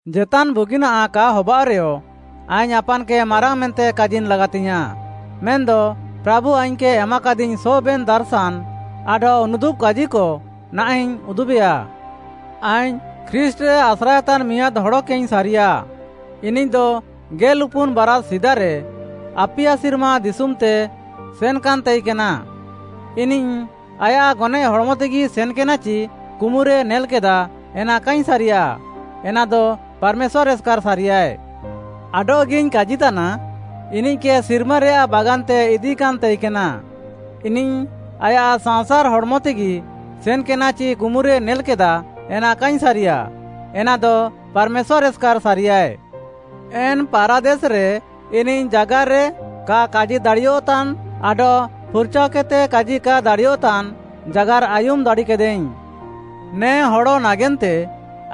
ଜେତାନ୍‌ ବୁଗିନାଃ କା ହବାଅଃରେୟ, ଆଇଙ୍ଗ୍‌ ଆପାନ୍‌କେ ମାରାଙ୍ଗ୍‌ ମେନ୍ତେ କାଜିନ୍ ଲାଗାତିଙ୍ଗ୍‌ୟାଁଃ। ମେନ୍‌ଦ ପ୍ରାଭୁ ଆଇଙ୍ଗ୍‌କେ ଏମାକାଦିଙ୍ଗ୍‌ ସବେନ୍‌ ଦାର୍‌ଶାନ୍‌ ଆଡଃ ଉନୁଦୁବ୍‌କାଜିକ ନାହାଁଃଇଙ୍ଗ୍‌ ଉଦୁବେୟା। ଆଇଙ୍ଗ୍‌ ଖ୍ରୀଷ୍ଟ୍‌ରେ ଆସ୍ରାଏତାନ୍‌ ମିଆଁଦ୍‌ ହଡ଼କେଇଙ୍ଗ୍‌ ସାରିୟାଃ, ଇନିଃଦ ଗେଲ୍‌ଉପୁନ୍‌ ବାରାଷ୍‌ ସିଦାରେ ଆପିୟା ସିର୍ମା ଦିଶୁମ୍‌ତେ ସେନ୍‌କାନ୍‌ ତାଇକେନା। ଇନିଃ ଆୟାଃ ଗନଏଃ ହଡ଼୍‌ମତେଗି ସେନ୍‌କେନା ଚି କୁମୁରେ ନେଲ୍‌କେଦା, ଏନା କାଇଙ୍ଗ୍‌ ସାରିୟା? ଏନାଦ ପାର୍‌ମେଶ୍ୱାର୍‌ ଏସ୍‌କାର୍‌ ସାରିୟାଏ। ଆଡଃଗିଇଙ୍ଗ୍‌ କାଜିତାନା, ଇନିଃକେ ସିର୍ମାରେୟାଃ ବାଗାନ୍‌ତେ ଇଦିକାନ୍‌ ତାଇକେନା। ଇନିଃ ଆୟାଃ ସାଂସାର୍‌ ହଡ଼୍‌ମତେଗି ସେନ୍‌କେନା ଚି କୁମୁରେ ନେଲ୍‌କେଦା, ଏନା କାଇଙ୍ଗ୍‌ ସାରିୟା? ଏନାଦ ପାର୍‌ମେଶ୍ୱାର୍‌ ଏସ୍‌କାର୍‌ ସାରିୟାଏ। ଏନ୍‌ ପାରାଦେସ୍‌ରେ ଇନିଃ ଜାଗାର୍‌ରେ କା କାଜି ଦାଡ଼ିୟଃତାନ୍ ଆଡଃ ଫୁର୍‌ଚାଅକେଦ୍‌ତେ କାଜି କା ଦାଡ଼ିୟଃତାନ୍‌ ଜାଗାର୍‌ ଆୟୁମ୍‌ ଦାଡ଼ିକେଦାଇଙ୍ଗ୍‌। ନେ ହଡ଼ ନାଗେନ୍ତେ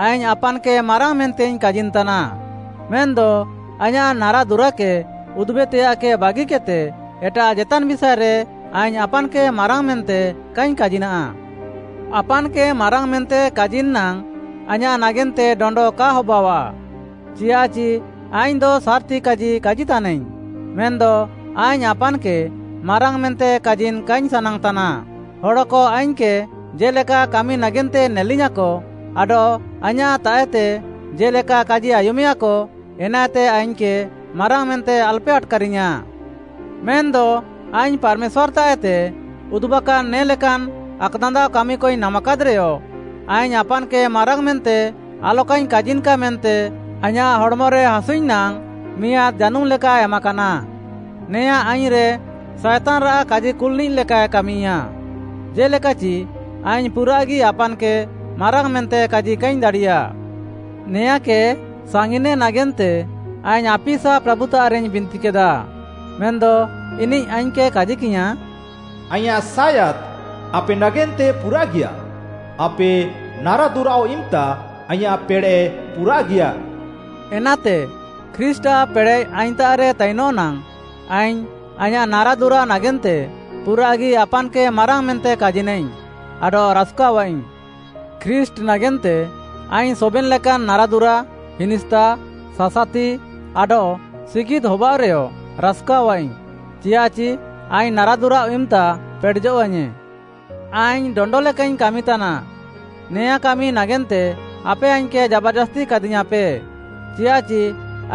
ଆଇଙ୍ଗ୍‌ ଆପାନ୍‌କେ ମାରାଙ୍ଗ୍‌ ମେନ୍ତେଇଙ୍ଗ୍‌ କାଜିନ୍‌ ତାନା। ମେନ୍‌ଦ ଆଇଁୟାଃ ନାରାଦୁରାକେ ଉଦୁବେତେୟାଃକେ ବାଗିକେଦ୍‌ତେ ଏଟାଃ ଜେତାନ୍‌ ବିଷାଏରେ ଆଇଙ୍ଗ୍‌ ଆପାନ୍‌କେ ମାରାଙ୍ଗ୍‌ ମେନ୍ତେ କାଇଙ୍ଗ୍‌ କାଜିନା। ଆପାନ୍‌କେ ମାରାଙ୍ଗ୍‌ ମେନ୍ତେ କାଜିନ୍‌ ନାଙ୍ଗ୍‌ ଆଇଁୟାଃ ନାଗେନ୍ତେ ଡଣ୍ଡ କା ହବାଅଃଆ, ଚିୟାଃଚି ଆଇଙ୍ଗ୍‌ଦ ସାର୍‌ତି କାଜି କାଜିତାନାଇଙ୍ଗ୍‌। ମେନ୍‌ଦ ଆଇଙ୍ଗ୍‌ ଆପାନ୍‌କେ ମାରାଙ୍ଗ୍‌ ମେନ୍ତେ କାଜିନ୍‌ କାଇଙ୍ଗ୍‌ ସାନାଙ୍ଗ୍‌ ତାନା, ହଡ଼କ ଆଇଙ୍ଗ୍‌କେ ଜେ'ଲେକା କାମି ନାଗେନ୍ତେ ନେଲିୟାଁକ ଆଡଃ ଆଇଁୟାଃତାଃଏତେ ଜେ'ଲେକା କାଜି ଆୟୁମେୟାକ, ଏନାଏତେ ଆଇଙ୍ଗ୍‌କେ ମାରାଙ୍ଗ୍‌ ମେନ୍ତେ ଆଲ୍‌ପେ ଆଟ୍‌କାରିୟାଁ। ମେନ୍‌ଦ ଆଇଙ୍ଗ୍‌ ପାର୍‌ମେଶ୍ୱାର୍‌ତାଃଏତେ ଉଦୁବାକାନ୍‌ ନେ ଲେକାନ୍‌ ଆକ୍‌ଦାନ୍ଦାଅ କାମିକଇଙ୍ଗ୍‌ ନାମାକାଦ୍‌ରେୟ, ଆଇଙ୍ଗ୍‌ ଆପାନ୍‌କେ ମାରାଙ୍ଗ୍‌ ମେନ୍ତେ ଆଲକାଇଙ୍ଗ୍‌ କାଜିନ୍‌କା ମେନ୍ତେ ଆଇଁୟାଃ ହଡ଼୍‌ମରେ ହାସୁଇଙ୍ଗ୍‌ ନାଙ୍ଗ୍‌ ମିଆଁଦ୍‌ ଜାନୁମ୍‌ ଲେକା ଏମାକାନା, ନେଆଁଁ ଆଇଙ୍ଗ୍‌ରେ ସାଏତାନ୍‌ରାଃ କାଜିକୁଲ୍‌ନିଃ ଲେକାଏ କାମିୟା, ଜେ'ଲେକାଚି ଆଇଙ୍ଗ୍‌ ପୁରାଃଗି ଆପାନ୍‌କେ ମାରାଙ୍ଗ୍‌ ମେନ୍ତେ କାଜି କାଇଙ୍ଗ୍‌ ଦାଡ଼ିୟା। ନେଆଁଁକେ ସାଙ୍ଗିନେ ନାଗେନ୍ତେ ଆଇଙ୍ଗ୍‌ ଆପିସା ପ୍ରାଭୁତାଃରେଇଙ୍ଗ୍‌ ବିନ୍ତିକେଦା, ମେନ୍‌ଦ ଇନିଃ ଆଇଙ୍ଗ୍‌କେ କାଜିକିୟାଁ, “ଆଇଁୟାଃ ସାୟାଦ୍‌ ଆପେ ନାଗେନ୍ତେ ପୁରାଃଗିୟା, ଆପେ ନାରାଦୁରାଃଅ ଇମ୍‌ତା ଆଇଁୟାଃ ପେଡ଼େଃ ପୁରାଃଗିଆ।” ଏନାତେ ଖ୍ରୀଷ୍ଟ୍‌ଆଃ ପେଡ଼େଃ ଆଇଙ୍ଗ୍‌ତାଃରେ ତାଇନଃ ନାଙ୍ଗ୍‌ ଆଇଙ୍ଗ୍‌ ଆଇଁୟାଃ ନାରାଦୁରା ନାଗେନ୍ତେ ପୁରାଃଗି ଆପାନ୍‌କେ ମାରାଙ୍ଗ୍‌ ମେନ୍ତେ କାଜିନାଇଙ୍ଗ୍‌ ଆଡଃ ରାସ୍‌କାଅଃଆଇଙ୍ଗ୍‌। ଖ୍ରୀଷ୍ଟ୍‌ ନାଗେନ୍ତେ ଆଇଙ୍ଗ୍‌ ସବେନ୍‌ ଲେକାନ୍‌ ନାରାଦୁରା, ହିନିସ୍ତା, ସାସାତି, ଆଡଃ ସିଗିଦ୍‌‌ ହବାଅଃରେୟ ରାସ୍‌କାଅଃଆଇଙ୍ଗ୍‌, ଚିୟାଃଚି ଆଇଙ୍ଗ୍‌ ନାରାଦୁରାଃଅ ଇମ୍‌ତା ପେଡ଼େଜଃଆଇଙ୍ଗ୍‌। ଆଇଙ୍ଗ୍‌ ଡଣ୍ଡ ଲେକାଇଙ୍ଗ୍‌ କାମିତାନା। ନେଆଁଁ କାମି ନାଗେନ୍ତେ ଆପେ ଆଇଙ୍ଗ୍‌କେ ଜାବାର୍‌ଜାସ୍ତି କାଦିୟାଁପେ, ଚିୟାଃଚି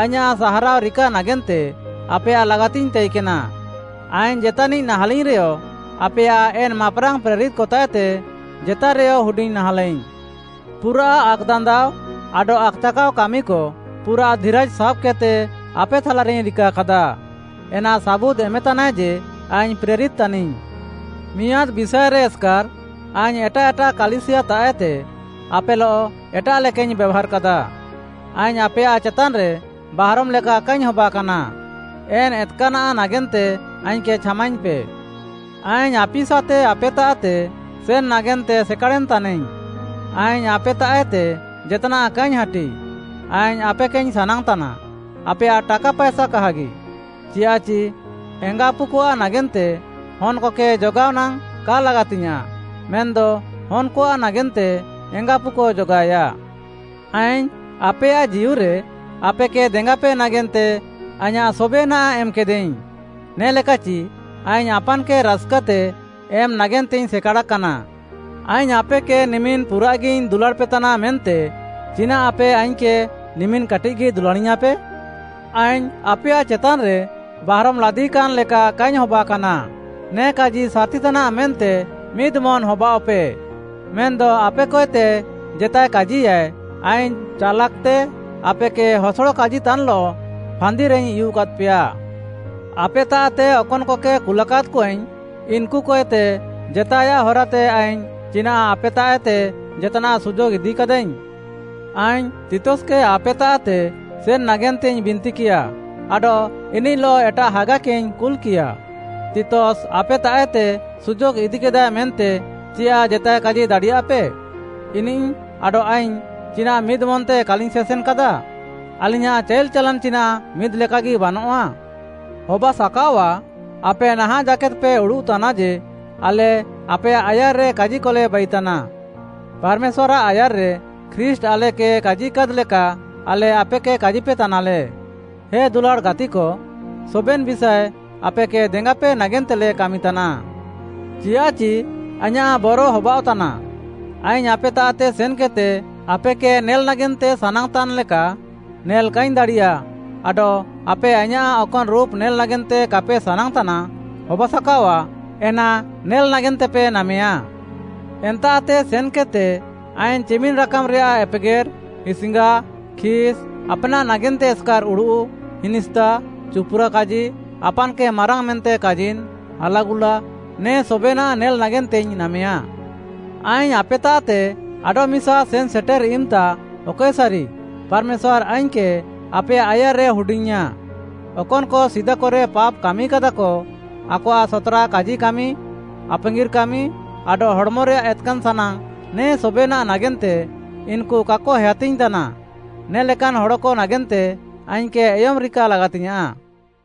ଆଇଁୟାଃ ସାହାରାଅ ରିକା ନାଗେନ୍ତେ ଆପେୟାଃ ଲାଗାତିଙ୍ଗ୍‌ ତାଇକେନା। ଆଇଙ୍ଗ୍‌ ଜେତାନିଃ ନାହାଁଲାଇଙ୍ଗ୍‌ରେୟ ଆପେୟାଃ ଏନ୍‌ ମାପ୍‌ରାଙ୍ଗ୍‌ ପ୍ରେରିତ୍‌କତାଃଏତେ ଜେତାରେୟ ହୁଡିଙ୍ଗ୍‌ ନାହାଁଲାଇଙ୍ଗ୍‌। ପୁରାଃ ଆକ୍‌ଦାନ୍ଦାଅ ଆଡଃ ଆକ୍‌ଚାକାଅ କାମିକ ପୁରାଃ ଧିରାଜ୍‌ ସାବ୍‌କେଦ୍‌ତେ ଆପେ ଥାଲାରେଇଙ୍ଗ୍‌ ରିକାକାଦା, ଏନା ସାବୁଦ୍‌ ଏମେତାନାଏ ଯେ, ଆଇଙ୍ଗ୍‌ ପ୍ରେରିତ୍‌ ତାନିଙ୍ଗ୍‌। ମିଆଁଦ୍‌ ବିଷାଏରେ ଏସ୍‌କାର୍‌ ଆଇଙ୍ଗ୍‌ ଏଟାଃ ଏଟାଃ କାଲିସିୟାତାଃଏତେ ଆପେଲଃ ଏଟାଃ ଲେକାଇଙ୍ଗ୍‌ ବେଭାର୍‌କାଦା। ଆଇଙ୍ଗ୍‌ ଆପେୟାଃ ଚେତାନ୍‌ରେ ବାହାରମ୍‌ ଲେକା କାଇଙ୍ଗ୍‌ ହବାକାନା। ଏନ୍‌ ଏତ୍‌କାନ୍‌ଆଃ ନାଗେନ୍ତେ ଆଇଙ୍ଗ୍‌କେ ଛାମାଇଙ୍ଗ୍‌ପେ। ଆଇଙ୍ଗ୍‌ ଆପିସାତେ ଆପେତାଃତେ ସେନ୍‌ ନାଗେନ୍ତେ ସେକାଡ଼େନ୍‌ ତାନାଇଙ୍ଗ୍‌। ଆଇଙ୍ଗ୍‌ ଆପେତାଃଏତେ ଜେତ୍‌ନାଃ କାଇଙ୍ଗ୍‌ ହାଟି। ଆଇଙ୍ଗ୍‌ ଆପେକେଇଙ୍ଗ୍‌ ସାନାଙ୍ଗ୍‌ତାନା, ଆପେୟାଃ ଟାକା ପାଏସା କାହାଗି। ଚିୟାଃଚି ଏଙ୍ଗାଆପୁକଆଃ ନାଗେନ୍ତେ ହନ୍‌କକେ ଜଗାଅ ନାଙ୍ଗ୍‌ କା ଲାଗାତିଙ୍ଗ୍‌ୟାଁଃ, ମେନ୍‌ଦ ହନ୍‌କଆଃ ନାଗେନ୍ତେ ଏଙ୍ଗାଆପୁକ ଜଗାଏୟା। ଆଇଙ୍ଗ୍‌ ଆପେୟାଃ ଜୀଉରେ ଆପେକେ ଦେଙ୍ଗାପେ ନାଗେନ୍ତେ ଆଇଁୟାଃ ସବେନାଃ ଏମ୍‌କେଦାଇଙ୍ଗ୍‌, ନେ'ଲେକାଚି ଆଇଙ୍ଗ୍‌ ଆପାନ୍‌କେ ରାସ୍‌କାତେ ଏମ୍‌ ନାଗେନ୍ତେଇଙ୍ଗ୍‌ ସେକାଡ଼ାକାନା। ଆଇଙ୍ଗ୍‌ ଆପେକେ ନିମିନ୍‌ ପୁରାଃଗିଇଙ୍ଗ୍‌ ଦୁଲାଡ଼୍‌ପେ ତାନା ମେନ୍ତେ ଚିନାଃ ଆପେ ଆଇଙ୍ଗ୍‌କେ ନିମିନ୍‌ କାଟିଃଗି ଦୁଲାଡ଼ିୟାଁପେ? ଆଇଙ୍ଗ୍‌ ଆପେୟାଃ ଚେତାନ୍‌ରେ ବାହାରମ୍‌ ଲାଦିୟାକାନ୍‌ ଲେକା କାଇଙ୍ଗ୍‌ ହବାକାନା। ନେ କାଜି ସାର୍‌ତିତାନାଃ ମେନ୍ତେ ମିଦ୍‌ମନ୍‌ ହବାଅଃଆପେ। ମେନ୍‌ଦ ଆପେକଏତେ ଜେତାଏ କାଜିୟାଏ, ଆଇଙ୍ଗ୍‌ ଚାଲାକ୍‌ତେ ଆପେକେ ହସଡ଼ କାଜିତାନ୍‌ଲଃ ଫାନ୍ଦିରେଇଙ୍ଗ୍‌ ଉୟୁଃକାଦ୍‌ପେୟା। ଆପେତାଃତେ ଅକନ୍‌କକେ କୁଲାକାଦ୍‌କଆଇଙ୍ଗ୍‌, ଇନ୍‌କୁକଏତେ ଜେତାଏୟାଃ ହରାତେ ଆଇଙ୍ଗ୍‌ ଚିନାଃ ଆପେତାଃଏତେ ଜେତାନ୍‌ ସୁଯୋଗ୍‌ ଇଦିକାଦାଇଙ୍ଗ୍‌। ଆଇଙ୍ଗ୍‌ ତିତସ୍‌କେ ଆପେତାଃତେ ସେନ୍‌ ନାଗେନ୍ତେଇଙ୍ଗ୍‌ ବିନ୍ତିକିୟା ଆଡଃ ଇନିଃଲଃ ଏଟାଃ ହାଗାକେଇଙ୍ଗ୍‌ କୁଲ୍‌କିୟା। ତିତସ୍‌ ଆପେତାଃଏତେ ସୁଯୋଗ୍‌ ଇଦିକାଦାଏ ମେନ୍ତେ ଚିୟାଃ ଜେତାଏ କାଜି ଦାଡ଼ିୟାପେ? ଇନିଃ ଆଡଃ ଆଇଙ୍ଗ୍‌ ଚିନାଃ ମିଦ୍‌ମନ୍‌ତେ କାଲିଙ୍ଗ୍‌ ସେସେନ୍‌କାଦା? ଆଲିଙ୍ଗ୍‌ୟାଁଃ ଚାଇଲ୍‌ ଚାଲାନ୍‌ ଚିନାଃ ମିଦ୍‌ଲେକାଗି ବାନଃଆ? ହବାସାକାଅଆଃ, ଆପେ ନାହାଁଃ ଜାକେଦ୍‌ପେ ଉଡ଼ୁଃତାନା ଯେ, ଆଲେ ଆପେୟାଃ ଆୟାର୍‌ରେ କାଜିକଲେ ବାଇତାନା। ପାର୍‌ମେଶ୍ୱାର୍‌ଆଃ ଆୟାର୍‌ରେ ଖ୍ରୀଷ୍ଟ୍‌ ଆଲେକେ କାଜିକାଦ୍‌ ଲେକା ଆଲେ ଆପେକେ କାଜିପେତାନାଲେ। ହେ ଦୁଲାଡ଼୍‌ ଗାତିକ, ସବେନ୍‌ ବିଷାଏ ଆପେକେ ଦେଙ୍ଗାପେ ନାଗେନ୍ତେଲେ କାମିତାନା। ଚିୟାଃଚି ଆଇଁୟାଃ ବର ହବାଅଃତାନା, ଆଇଙ୍ଗ୍‌ ଆପେତାଃତେ ସେନ୍‌କେଦ୍‌ତେ ଆପେକେ ନେଲ୍‌ ନାଗେନ୍ତେ ସାନାଙ୍ଗ୍‌ତାନ୍‌ ଲେକା ନେଲ୍‌ କାଇଙ୍ଗ୍‌ ଦାଡ଼ିୟା ଆଡଃ ଆପେ ଆଇଁୟାଃ ଅକନ୍‌ ରୁପ୍‌ ନେଲ୍‌ ନାଗେନ୍ତେ କାପେ ସାନାଙ୍ଗ୍‌ତାନା, ହବାସାକାଅଆଃ, ଏନା ନେଲ୍‌ ନାଗେନ୍ତେପେ ନାମେୟାଁ। ଏନ୍ତାଃତେ ସେନ୍‌କେଦ୍‌ତେ ଆଇଙ୍ଗ୍‌ ଚିମିନ୍‌ ରାକାମ୍‌ରେୟାଃ ଏପେଗେର୍‌, ହିସ୍‌ଙ୍ଗା, ଖିସ୍‌, ଆପ୍‌ନାଃ ନାଗେନ୍ତେ ଏସ୍‌କାର୍‌ ଉଡ଼ୁଃ, ହିନିସ୍ତା, ଚୁପୁରାକାଜି, ଆପାନ୍‌କେ ମାରାଙ୍ଗ୍‌ ମେନ୍ତେ କାଜିନ୍‌, ହାଲାଗୁଲା ନେ ସବେନାଃ ନେଲ୍‌ ନାଗେନ୍ତେଇଙ୍ଗ୍‌ ନାମେୟାଁ। ଆଇଙ୍ଗ୍‌ ଆପେତାଃତେ ଆଡଃମିସା ସେନ୍‌ସେଟେର୍‌ ଇମ୍‌ତା ଅକଏସାରି ପାର୍‌ମେଶ୍ୱାର୍‌ ଆଇଙ୍ଗ୍‌କେ ଆପେୟାଃ ଆୟାର୍‌ରେ ହୁଡିଙ୍ଗ୍‌ଇୟାଁ, ଅକନ୍‌କ ସିଦାକରେ ପାପ୍‌ କାମିକାଦାକ, ଆକଆଃ ସତ୍‌ରା କାଜିକାମି, ଆପାଙ୍ଗିର୍‌ କାମି, ଆଡଃ ହଡ଼୍‌ମରେୟାଃ ଏତ୍‌କାନ୍‌ ସାନାଙ୍ଗ୍‌ ନେ ସବେନାଃ ନାଗେନ୍ତେ ଇନ୍‌କୁ କାକ ହେୟାତିଙ୍ଗ୍‌ ତାନା, ନେ ଲେକାନ୍‌ ହଡ଼କ ନାଗେନ୍ତେ ଆଇଙ୍ଗ୍‌କେ ଏୟମ୍‌ ରିକା ଲାଗାତିଙ୍ଗ୍‌ୟାଁଃ।